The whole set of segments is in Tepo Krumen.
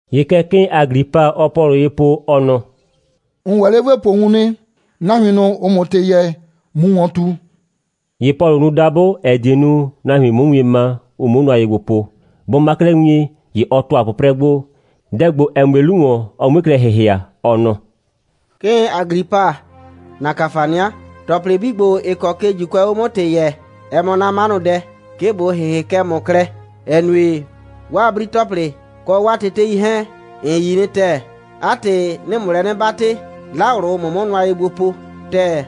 ‑Ye kɛ 'kɩɩn Aglipa, ɔɔ Pɔlʋ ye po, ɔ nɔ: «‑N ‑wɛ 'le ‑bo po wun nɩ, nahuin ꞊nʋ, ‑ʋʋ ‑mʋ ‑tɩ yɛɛ, ꞊mu ‑wɔn ꞊tu.» ‑Ye Pɔlʋ nu dabʋ, ‑ɛ die nu, nahuin 'mʋ wien ma, ʋ 'muo nʋa ye gbo po. Bʋ ma 'klɛɛ wien, ‑ye ɔ ‑tʋa 'pʋprɛ gbo, dɛ ‑gbo, ‑ɛ mue 'lu ‑wɔn, ɔ 'mue klɛ ‑hɩhɩa, ɔ nɔ: «'Kɩɩn Aglipa, ‑na ‑kafania. ‑Tɔplɩ 'bii ‑gbo, ‑ɩ kɔ ke ‑Juukʋɛɛ 'o 'mʋ ‑tɩ yɛɛ, ɛ mɔ 'na 'manʋdɛ, 'ke ꞊bo ‑hɩhɩ kɛ ‑mʋ klɛ, ‑ɛ nue, 'waa 'bri‑tɔplɩ, kɔ 'waa tetei 'hɛɛn, ‑n yi nɩ ‑tɛɛ. 'A ‑tɩ, 'nɩɩ ‑mʋ lɛ 'nɩ 'batɩ, 'la ꞊wlʋ, ꞊mʋ 'mʋ nʋa ye gbo po ‑tɛɛ.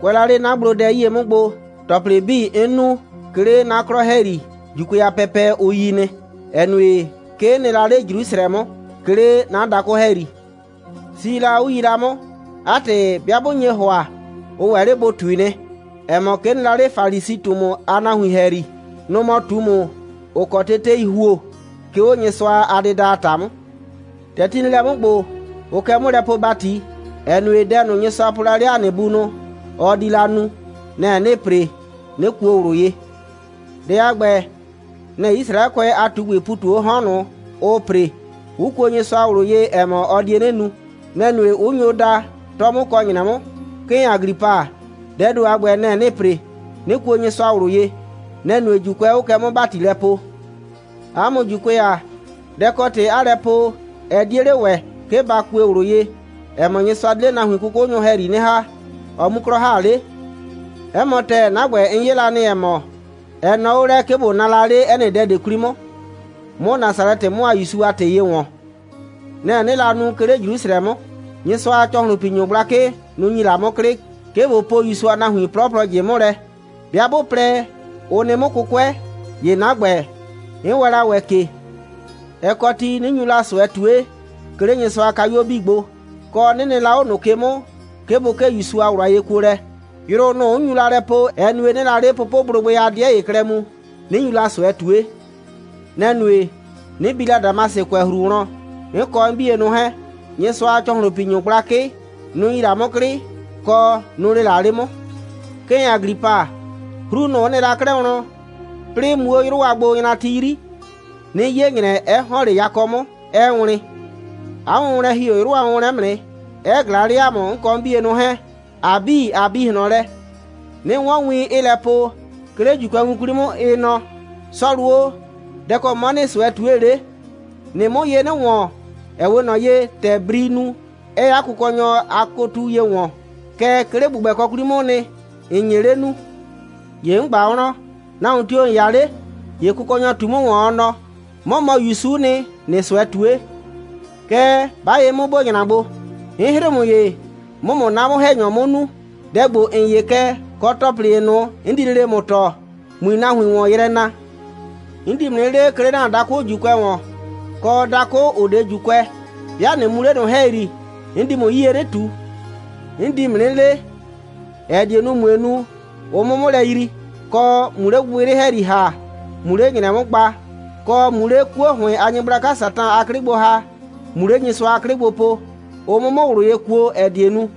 Kʋɛ la 'le 'na gblodɛ 'yie 'mʋ gbo, ‑tɔplɩ 'bii, 'n nu, 'ke 'le 'na 'klɔ ‑hɛyri, ‑Juukʋɛ a pɛpɛ, ʋ yi nɩ, ‑ɛ nue, kɛ 'n nɩ la 'le Jrusrɛ 'mʋ, 'ke 'le 'na dakʋ ‑hɛyri. Si la, 'ʋ yi la 'mʋ. 'A ‑tɩ, 'bɩa 'bʋ nye ‑hʋa, ʋ ‑wɛ 'le bʋ ꞊tui nɩ, ‑ɛ mɔ, 'ke 'n nɩ la 'le Falisi꞊tumu a nahuin ‑hɛyri. Nʋ‑ mɔ ꞊tumu, ‑ʋ kɔ tetei ‑huo, 'ke 'o Nyɩsʋa a dɩda a ‑ta 'mʋ. ‑Tɛ ti nɩ lɛ 'mʋ ‑gbo, ʋʋ kɛ 'mʋ lɛ poo ‑bati, ‑ɛ nue, dɛ ꞊nʋ, Nyɩsʋa po la 'le ‑a nɩ bunʋ, ɔ di la nu, nɛ‑ 'nɩɩ ‑pre, 'nɩ kuo ꞊wlʋ ye. Dɛ a ‑gbɛ, nɛ‑ Yisraɛkʋɛ a ꞊tugbɩɩ ‑pu ꞊tu 'o 'hɔn ꞊nʋ, ʋʋ ‑pre, 'ʋ kuo Nyɩsʋa ꞊wlʋ ye, ‑ɛ mɔ, ɔ die 'nɩ nu. Nɛ‑ nue, 'ʋ nyo da, 'tɔ 'mʋ kɔ ‑nyrɛ 'mʋ. 'Kɩɩn Aglipa, dɛɛ ‑do a ‑gbɛ, nɛ‑ 'nɩɩ ‑pre, 'nɩ kuo Nyɩsʋa ꞊wlʋ ye. Nɛ‑ nue, ‑Juukʋɛ 'ʋʋ kɛ 'mʋ ‑bati lɛ poo. 'A mʋ ‑Juukʋɛ ‑a, dɛ‑ kɔ ‑tɩ 'aa lɛ po, ɛ 'die 'le ‑wɛ, 'ke ‑ba kue ꞊wlʋ ye, ‑ɛ mɔ, Nyɩsʋa di 'le nahuin 'kʋkʋnyʋ ‑hɛyri 'nɩ ‑ha, ɔ 'mu 'klɔ ‑ha 'le? 'Ɛ mɔ ‑tɛɛ, 'na ‑gbɛ, 'n 'ye la nɩ, ‑ɛ mɔ, ɛ nɔɔ 'o lɛ, 'ke ꞊bo naa la 'le 'ɛ nɩ dɛ ꞊de 'kwli 'mʋ, 'mʋ Nasalɛtɩ 'mʋ a ‑Yusu a ‑tɩ ye ‑wɔn. Nɛ‑ 'nɩɩ la nu, 'ke 'le Jrusrɛ 'mʋ. Nyɩsʋa a ‑cɔhlʋnpinyʋ gblakɩ, nʋ‑ ‑nyi la 'mʋ 'klɩ, 'ke ꞊bo po ‑Yusu a nahuin 'plɔplɔ ꞊jɩ 'mʋ lɛ. 'Bɩa 'bʋ plɛ, ʋ nɩ 'mʋ 'kʋkʋɛ, ‑ye 'na ‑gbɛ, 'n wɛɛn la ‑wɛ ke. Ɛ kɔ ti, 'nɩ nyu la ꞊sʋɛ ꞊tue, 'ke 'le Nyɩsʋa a kayuo 'bii gbo, kɔ, 'nɩ nɩ la 'o ꞊nʋ ke 'mʋ, 'ke bʋ 'kee ‑Yusu a ꞊wlʋ a yekuolɛ. Yrʋ ꞊nʋ, 'n nyu la lɛ poo, ɛ nue, 'nɩɩ la 'le pʋpʋblʋgbɩ a 'dɩɛ ‑ye klɛ mu, 'nɩ nyu la ꞊sʋɛ ꞊tue.» «Nɛ‑ nue, 'nɩ bi la Damasɩkʋɛhru wlɔn, 'n kɔ 'n 'bienʋ 'hɛɛn. Nyɩsʋa a ‑cɔhlʋnpinyʋ gblakɩ, nʋ‑ ‑nyi la 'mʋ 'klɩ, kɔ, nʋ‑ lee la 'le 'mʋ. 'Kɩɩn Aglipa, 'hru, nʋ‑ 'n nɩ la 'klɛɛ wlɔn, 'plɩɩ, muu 'o 'yrʋ a gbonyrati 'yri, 'nɩ 'ye ‑nyrɛ, 'ɛ ‑hɔn 'le yakɔ 'mʋ, 'ɛɛ wlɩn. 'A wʋnwlɛn ‑hi 'o 'yrʋ a wʋnwlɛn 'mʋ nɩ, 'ɛ ꞊glaa 'le ‑a mʋ, 'n kɔ 'na 'bienʋ 'hɛɛn, ‑a 'bii, ꞊a bi ꞊hlɔn lɛ, 'nɩ 'wɔn win, 'ɩɩ lɛ po, 'ke 'le ‑Juukʋɛwin 'kwli 'mʋ, ɩ nɔ: Sɔlʋ o, dɛ‑ kɔ 'mɔ ‑nɩɩ ꞊sʋɛ ꞊tue 'le? ‑Nɩɩ 'mʋ ye 'nɩ ‑wɔn, ‑ɛ 'we ꞊nɔ ye, ‑tɛ brii nu, 'ɛɛ 'a kʋkɔnyɔ a kotu ye ‑wɔn. Kɛɛ, 'ke 'le ‑gbʋgbɛkɔ 'kwli 'mʋʋ nɩ, ‑n nye 'le nuu. ‑Ye 'n ꞊gba wlɔn: Nahuon tio‑ ‑n 'ya 'le? ‑Ye Kʋkɔnyɔ ꞊tu 'mʋ ‑wɔn, ɔ nɔ: 'Mɔ mɔ ‑Yusu'u nɩ, ‑nɩɩ ꞊sʋɛ ꞊tue. Kɛɛ, 'ba ye 'mʋ, ‑bo nyra gbo. 'N 'hrɩɩ ‑mʋ ye, 'mʋ ‑mʋ 'na 'mʋ‑hɛnyɔ 'mʋ nuu, dɛ ‑gbo, ‑n 'ye kɛ, kɔ ‑tɔplɩ ‑ye ꞊nʋ, 'n di lele ‑mʋ tɔɔ, ꞊mui nahuin ‑wɔn yrɛ na. 'N di ‑mʋ 'nɩ lee, 'ke 'le ‑na dakʋ ‑Juukʋɛ ‑wɔn, kɔ dakʋ, ‑ʋ 'de ‑Juukʋɛ. 'Bɩa ꞊nɩ mu 'le ꞊nʋ ‑hɛyri, 'n di ‑mʋ 'yie 'nɩ ꞊tu. 'N di ‑mʋ 'nɩ lee, ‑ɛ die nu, ꞊mue nu, ʋ 'mʋ 'mʋ lɛ yrii, kɔ, ꞊mu 'le gbɩgbɩyrɩ ‑hɛyri ‑ha, ꞊mu 'le ‑nyrɛ 'mʋ gba, kɔ, ꞊mu 'le 'kuo ‑hʋɩn a nyɩgblaka Satan a 'klɩ gbo ‑ha, ꞊mu 'le Nyɩsʋa a 'klɩ gbo po, ʋ 'mʋ 'mʋ ꞊wlʋ ye kuo, ‑ɛ die nu,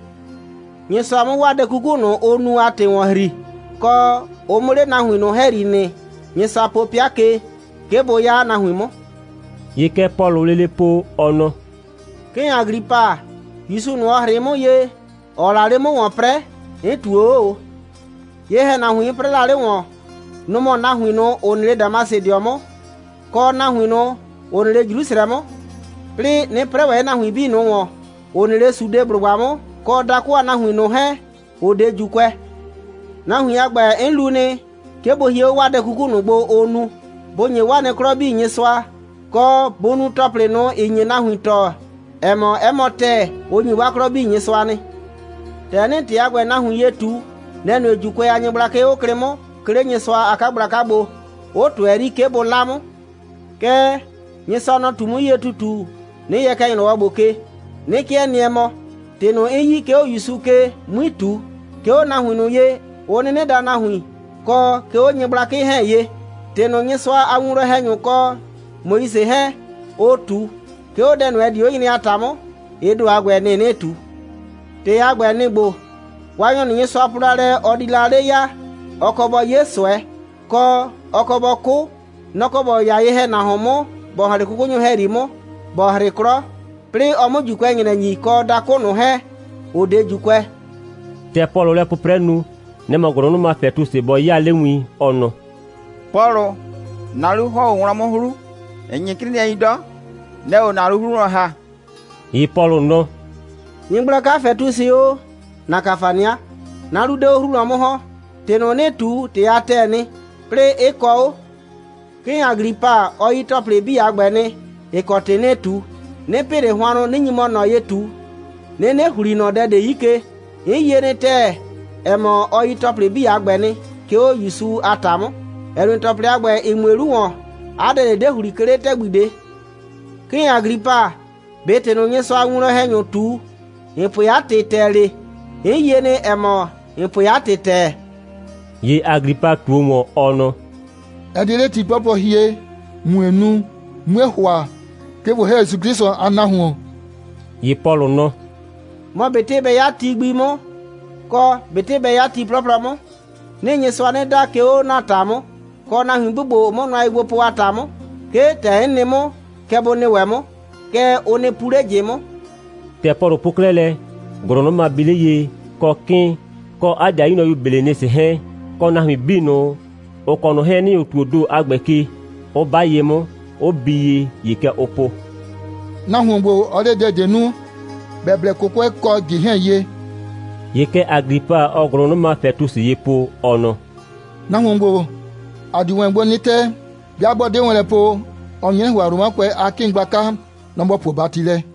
Nyɩsʋa 'mʋ 'waa dɛ 'kuku ꞊nʋ, ʋ nu a ‑tɩ ‑wɔn ‑hri, kɔ, ʋ 'mʋ 'le nahuin ꞊nʋ ‑hɛyri nɩ, Nyɩsʋa po 'pɩa ke, 'ke bʋ 'ya 'a nahuin 'mʋ.» ‑Ye kɛ Pɔlʋʋ lele po, ɔ nɔ: «'Kɩɩn Aglipa, ‑Yusu ꞊nʋ, ‑ɔ 'hrɩɩ 'mʋ ye, ‑ɔɔ la 'le 'mʋ ‑wɔn 'prɛɛ, 'n ꞊tuo 'o ꞊o. Ye‑hɛnahuin, 'n 'prɛɛ la 'le ‑wɔn, nʋ‑ mɔ nahuin ꞊nʋ, ‑ʋ nɩ 'le Damasɩdɩɔ 'mʋ, kɔ nahuin ꞊nʋ, ‑ʋ nɩ 'le Jrusrɛ 'mʋ, 'plɩɩ 'nɩ 'prɛɛ ‑wɛ 'le nahuin 'bii ꞊nʋ ‑wɔn, ‑ʋ nɩ 'le Sudeblʋgba 'mʋ, kɔ dakʋ a nahuin ꞊nʋ 'hɛɛn, ‑ʋ 'de ‑Juukʋɛ. Nahuin a ‑gbɛ, 'n lu nɩ, 'ke bʋ hie 'o 'waa dɛ 'kuku ꞊nʋ gbo, ʋʋ nu, bʋ ‑nye 'waa nɩ 'klɔ 'bii Nyɩsʋa, kɔ, bʋ nu ‑tɔplɩ ꞊nʋ, ‑ɩ nye nahuin tɔɔ, ‑ɛ mɔ, 'ɛ mɔ ‑tɛɛ, ʋ ‑nyi 'waa 'klɔ 'bii Nyɩsʋa nɩ. ‑Tɛ 'nɩɩ ‑tɩ a ‑gbɛ nahuin ye ꞊tu, nɛ‑ nue, ‑Juukʋɛ a nyɩgblakɩ 'ʋ klɩ 'mʋ, 'ke 'le Nyɩsʋa a 'kagblaka gbo, 'ʋ ꞊tʋɛ 'yri, 'ke bʋ 'la 'mʋ. Kɛɛ, Nyɩsʋa, nɔ‑ ꞊tu 'mʋ 'yie ‑tutu, 'nɩ yɛ kɛ ‑nyrɔwɔ ‑gbo ke, 'nɩ 'kɩɛ nɩɛ mɔ, ‑tɩ ꞊nʋ, 'n yi, 'ke 'o ‑Yusu ke, 'mui ꞊tu, 'ke 'o nahuin ꞊nʋ ye, ʋ 'nɩnɩ daa nahuin, kɔ 'ke 'o nyɩgblakɩ 'hɛɛn ye. ‑Tɩ ꞊nʋ, Nyɩsʋa a winwlɔn‑hɛnyʋ kɔ Moise 'hɛɛn, ʋ ꞊tu, 'ke 'o dɛ ꞊nʋ, ‑ɛ di 'o nyre a ‑ta 'mʋ, ɩ ‑do a ‑gbɛ, nɩ‑ 'nɩɩ ꞊tu. ‑Tɩ a ‑gbɛ, nɩ‑ ‑gbo: Waanyɔ ꞊nʋ, Nyɩsʋa po la lɛ, ɔ di la 'le ya, ɔ kɔ bɔ 'ye ꞊sʋɛ, kɔ, ɔ kɔ bɔ 'kʋ. Nɔ‑ kɔ ‑bɔ 'ya ye‑hɛnahuon 'mʋ, ‑bɔ ‑hɔn 'le 'kʋkʋnyʋ ‑hɛyri 'mʋ, ‑bɔ 'hrɩ 'klɔ, 'plɩɩ ɔ 'mʋ ‑Juukʋɛ ‑nyrɛ ‑nyi, kɔ dakʋ ꞊nʋ 'hɛɛn, ‑ʋ 'de ‑Juukʋɛ.» ‑Tɛ Pɔlʋʋ lɛ 'pʋprɛ nu, nɛ‑ mɔ ‑gʋlʋnʋma Fɛtusɩ bɔ 'yaa 'le win, ɔ nɔ: «Pɔlʋ, ‑na 'lu ‑hɔn 'o wlɔn 'mʋ 'hru. ‑N 'nyɩ 'crɩɩnɩɛi 'dɔ. Nɛ‑ɛ 'o ‑na 'lu 'hru wlɔn ‑ha.» ‑Ye Pɔlʋ nɔ: «Nyɩgblaka Fɛtusɩ o, ‑na ‑kafania. 'Na 'lu 'de 'o 'hru wlɔn 'mʋ ‑hɔn. ‑Tɩ ꞊nʋ, 'nɩɩ ꞊tu, ‑tɩ a ‑tɛɛ nɩ, 'plɩɩ 'ɩ kɔ 'o. 'Kɩɩn Aglipa, ɔ yi ‑tɔplɩ 'bii a ‑gbɛ nɩ, ‑ɩ kɔ ‑tɩ 'nɩɩ ꞊tu. 'Nɩ pɩ ꞊le hʋannʋ, 'nɩ nyi mɔ ꞊nɔ ye ꞊tu, 'nɩnɩ ‑hli ꞊nɔ dɛ ꞊de 'yi ke. 'N yie nɩ ‑tɛɛ, ‑ɛ mɔ, ɔ yi ‑tɔplɩ 'bii a ‑gbɛ nɩ, 'ke 'o ‑Yusu a ‑ta 'mʋ, ‑ɛ nue, ‑tɔplɩ a ‑gbɛ, ‑ɩ mue 'lu ‑wɔn, 'a dɛ ꞊de 'de ‑hli, 'ke 'le ‑tɛgbi ꞊de. 'Kɩɩn Aglipa, ꞊be ‑tɩ ꞊nʋ, Nyɩsʋa a winwlɔn‑hɛnyʋ ꞊tu, ‑n pue 'a ‑tɩ ‑tɛɛ 'le? 'N yie nɩ, ‑ɛ mɔ, ‑n pue 'a ‑tɩ ‑tɛɛ.» ‑Ye Aglipa ꞊tuo ‑wɔn, ɔ nɔ: «Ɛ 'de 'le ti 'plɔplɔ hie, ꞊mue nu, 'mue ‑hʋa, 'ke ꞊bo ‑hɛ ‑Yusu 'Klɩsʋ a nahuon.» ‑Ye Pɔlʋ nɔ: «Mɔ ꞊betɩ bɛ 'ya ti gbi 'mʋ, kɔ, ꞊betɩ bɛ 'ya ti 'plɔplɔ 'mʋ, 'nɩɩ Nyɩsʋa 'nɩ da, 'ke 'o ‑na ‑ta 'mʋ, kɔ nahuin 'bii ‑gbo, ‑ʋʋ 'mʋ nʋa ye gbo po a ‑ta 'mʋ, 'ke, ‑tɛ 'n nɩ 'mʋ, kɛ bʋ nɩ ‑wɛ 'mʋ. Kɛɛ, ʋ nɩ pu 'le ꞊jɩ 'mʋ.» ‑Tɛ Pɔlʋ po 'klɛɛ lɛ, ‑gʋlʋnʋma bi 'le ye, kɔ 'kɩɩn, kɔ 'a ‑dɩayu nyrɔyu Belenisɩ 'hɛɛn, kɔ nahuin 'bii ꞊nʋ, ‑ʋ kɔ ꞊nʋ 'hɛɛn ‑nɩ 'o ‑tuoo ‑do a ‑gbɛ ke, 'ʋ 'ba ye 'mʋ, 'ʋ bii ye, ‑ye kɛ ʋ po: «Nahuon ‑gbo, ɔ 'de dɛ ꞊de nu, ‑bɛ blɛ 'kʋkʋɛ kɔ ꞊jɩ 'hɛɛn ye.» ‑Ye kɛ Aglipa, ɔɔ ‑gʋlʋnʋma Fɛtusɩ ye po, ɔ nɔ: «Nahuon ‑gbo, ‑a dio wɛn gbo 'nɩ tɛ, 'bɩa 'bɔ 'de wɛn lɛ po, ɔ nye 'nɩ ‑hʋa, Romakʋɛ a 'kɩɩn gblaka, nɔ‑ ‑bɔ puo ‑bati lɛ.»